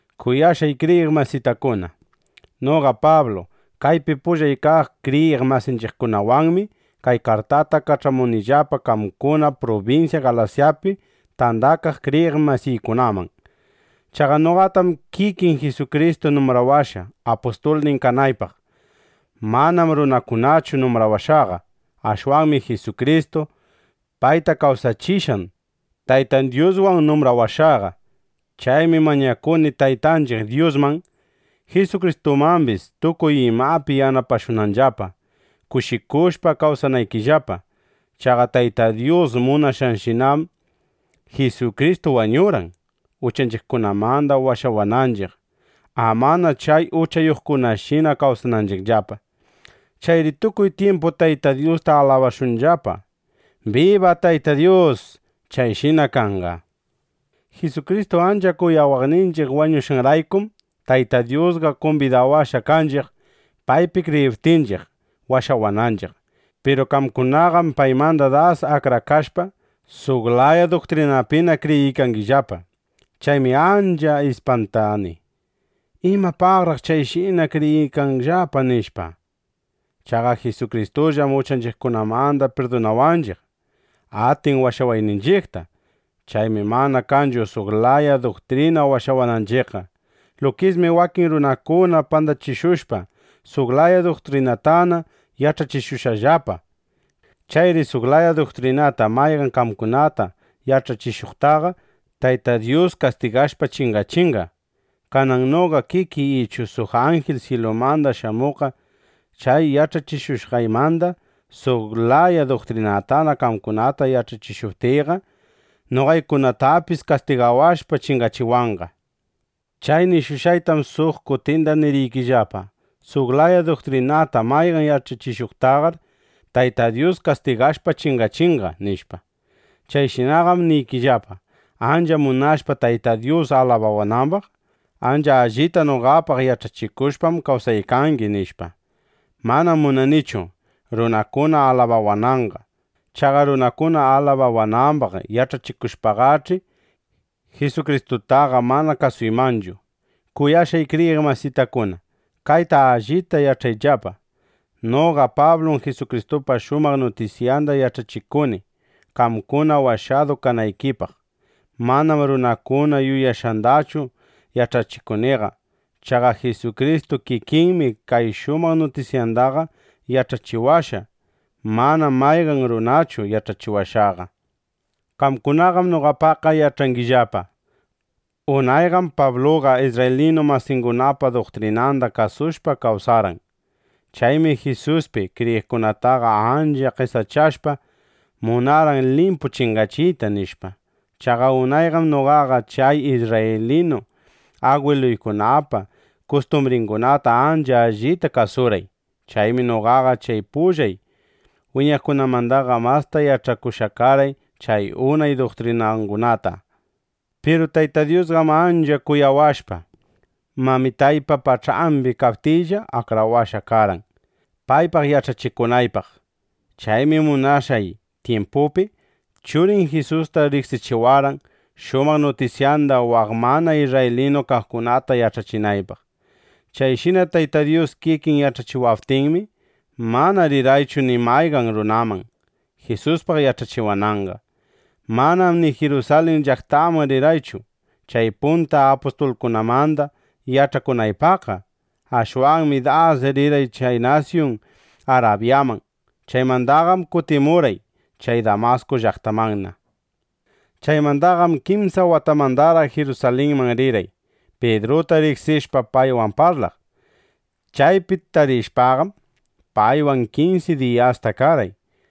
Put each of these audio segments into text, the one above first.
Kuyashqay kriyiq masitakuna, noqa Pablu, kaypi pullay kaq kriyiq masinchiqkunawanmi kay kartata kach'amunillapa qamkuna prubinsya Galasyapi tandakaq kriyiq masiykunaman. Chaqa noqatam kikin Jisukristu numbrawashqa, apustulnin kanaypaq. Manam runakunachu numbrawashqaqa. Ashwanmi Jisukristu, payta kawsachishqan Taytan Dyuswan numbrawashqaqa. Chaymi mañakuni Taytanchiq Dyusman, Jisukristumambis, tukuy imapi yanapashunanllapa, kushikushpa kawsanaykillapa. Chaqa Tayta Dyus munashqanshinam Jisukristu wañurqan, uchanchiqkunamanda washawananchiq, amana chay uchayuqkunashina kawsananchiqllapa. ¡Chayri tukuy tyimpu Tayta Dyusta alabashunllapa! ¡Biba Tayta Dyus! ¡Chayshina kanqa! Jisukristu ancha kuyawaqninchiq wañushqanraykum, Tayta Dyusqa kumbidawashqa kanchiq, paypi kriyiptinchiq, washawananchiq. Piru qamkunaqam paymanda das akrakashpa, suq laya duktrinapina kriyiykangillapa. Chaymi ancha ispantani: ¿Imapaqraq chayshina kriyiykanllapa? nishpa. Chaqa Jisukristullam uchanchiqkunamanda pirdunawaqninchiq, atin washawayninchiqta. Chaymi mana kanchu suq laya duktrina washawananchiqqa. Lukismi wakin runakuna pandachishushpa, suq laya duktrinatana yach'achishungillapa. Chayri suq laya duktrinata mayqan qamkunata yach'achishuqtaqa Tayta Dyus kastigashpa chingachinqa. Kanan noqa kikiy ichu suq anjil syilumanda shamuqqa chay yach'achishushqaymanda suq laya duktrinatana qamkunata yach'achishuptiyqa, noqaykunatapis kastigawashpa, chingachiwanqa. Chay nishushqaytam suq kutinda niriykillapa: Suq laya duktrinata mayqan yach'achishuqtaqar, Tayta Dyus kastigashpa chingachinqa, nishpa. Chayshinaqam niykillapa, ancha munashpa Tayta Dyus alabawanambaq: “Ancha allita noqapaq yach'achikushpam, kawsaykangi”, nishpa. Manam munanichu, runakuna alabawananqa. Chaqa runakuna alabawanambaq yach'achikushpaqach'i, Jisukristutaqa manana kasuymanchu. Kuyashqay kriyiq masitakuna, kayta allita yach'ayllapa: Noqa Pablum Jisukristupa shumaq nutisyanda yach'achikuni, qamkuna washadu kanaykipaq. Manam runakuna yuyashqandachu yach'achikuniqa. Chaqa Jisukristu kikinmi kay shumaq nutisyandaqa yach'achiwashqa. Manam mayqan runachu yach'achiwashqaqa. Qamkunaqam noqapaqqa yach'angillapa: Unayqam Pabluqa isrraylinu masingunapa duktrinanda kasushpa kawsarqan. Chaymi Jisuspi kriyiqkunataqa ancha qesachashpa, munarqan limpu chingachiyta, nishpa. Chaqa unayqam noqaqa chay isrraylinu agwiluykunapa kustumbringunata ancha allita kasurqay. Chaymi noqaqa chay pullay wiñaqkunamandaqa masta yach'akushqa karqay chay unay duktrinangunata. Piru Tayta Dyusqam ancha kuyawashpa, mamitaypa pach'ambi kaptiylla, akrawashqa karqan, paypaq yach'achikunaypaq. Chaymi munashqan tyimpupi, Churin Jisusta riqsichiwarqan, shumaq nutisyanda waq mana isrraylinu kaqkunata yach'achinaypaq. Chayshina Tayta Dyus kikin yach'achiwaptinmi, mana rirqaychu ni mayqan runaman, Jisuspaq yach'achiwananqa. Manam ni Jirusalin llaqtaman rirqaychu, chay punta apustulkunamanda yach'akunaypaqqa. Ashwanmi das rirqay chay nasyun Arabyaman. Chaymandaqam kutimurqay chay Damasku llaqtamanna. Chaymandaqam kimsa watamandaraq Jirusalinman rirqay, Pidruta riqsishpa paywan parlaq. Chaypi tarishpaqam, paywan kinsi diyasta karqay.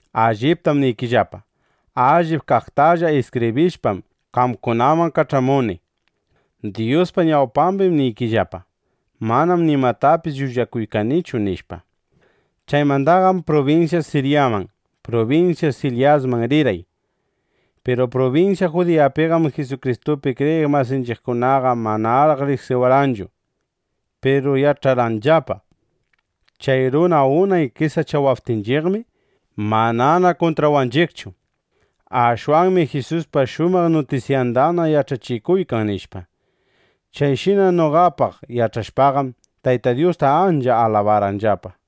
Alliptam niykillapa: Allip kaqtalla iskibrishpam, qamkunaman kach'amuni. Dyuspa ñawpambim niykillapa: Manam nimatapis llullakuykanichu, nishpa. Chaymandaqam prubinsya Siryaman, prubinsya Silisyaman rirqay. Piru prubinsya Judiyapiqam Jisukristupi kriyiq masinchiqkunaqa manaraq riqsiwarqanchu. Piru yach'arqanllapa: Chay runa unay qesachawaqninchiqmi manana kuntrawanchiqchu. Ashwanmi Jisuspa shumaq nutisyandana yach'achikuykan, nishpa. Chayshina noqapaq yach'ashpaqam, Tayta Dyusta ancha alabarqanllapa.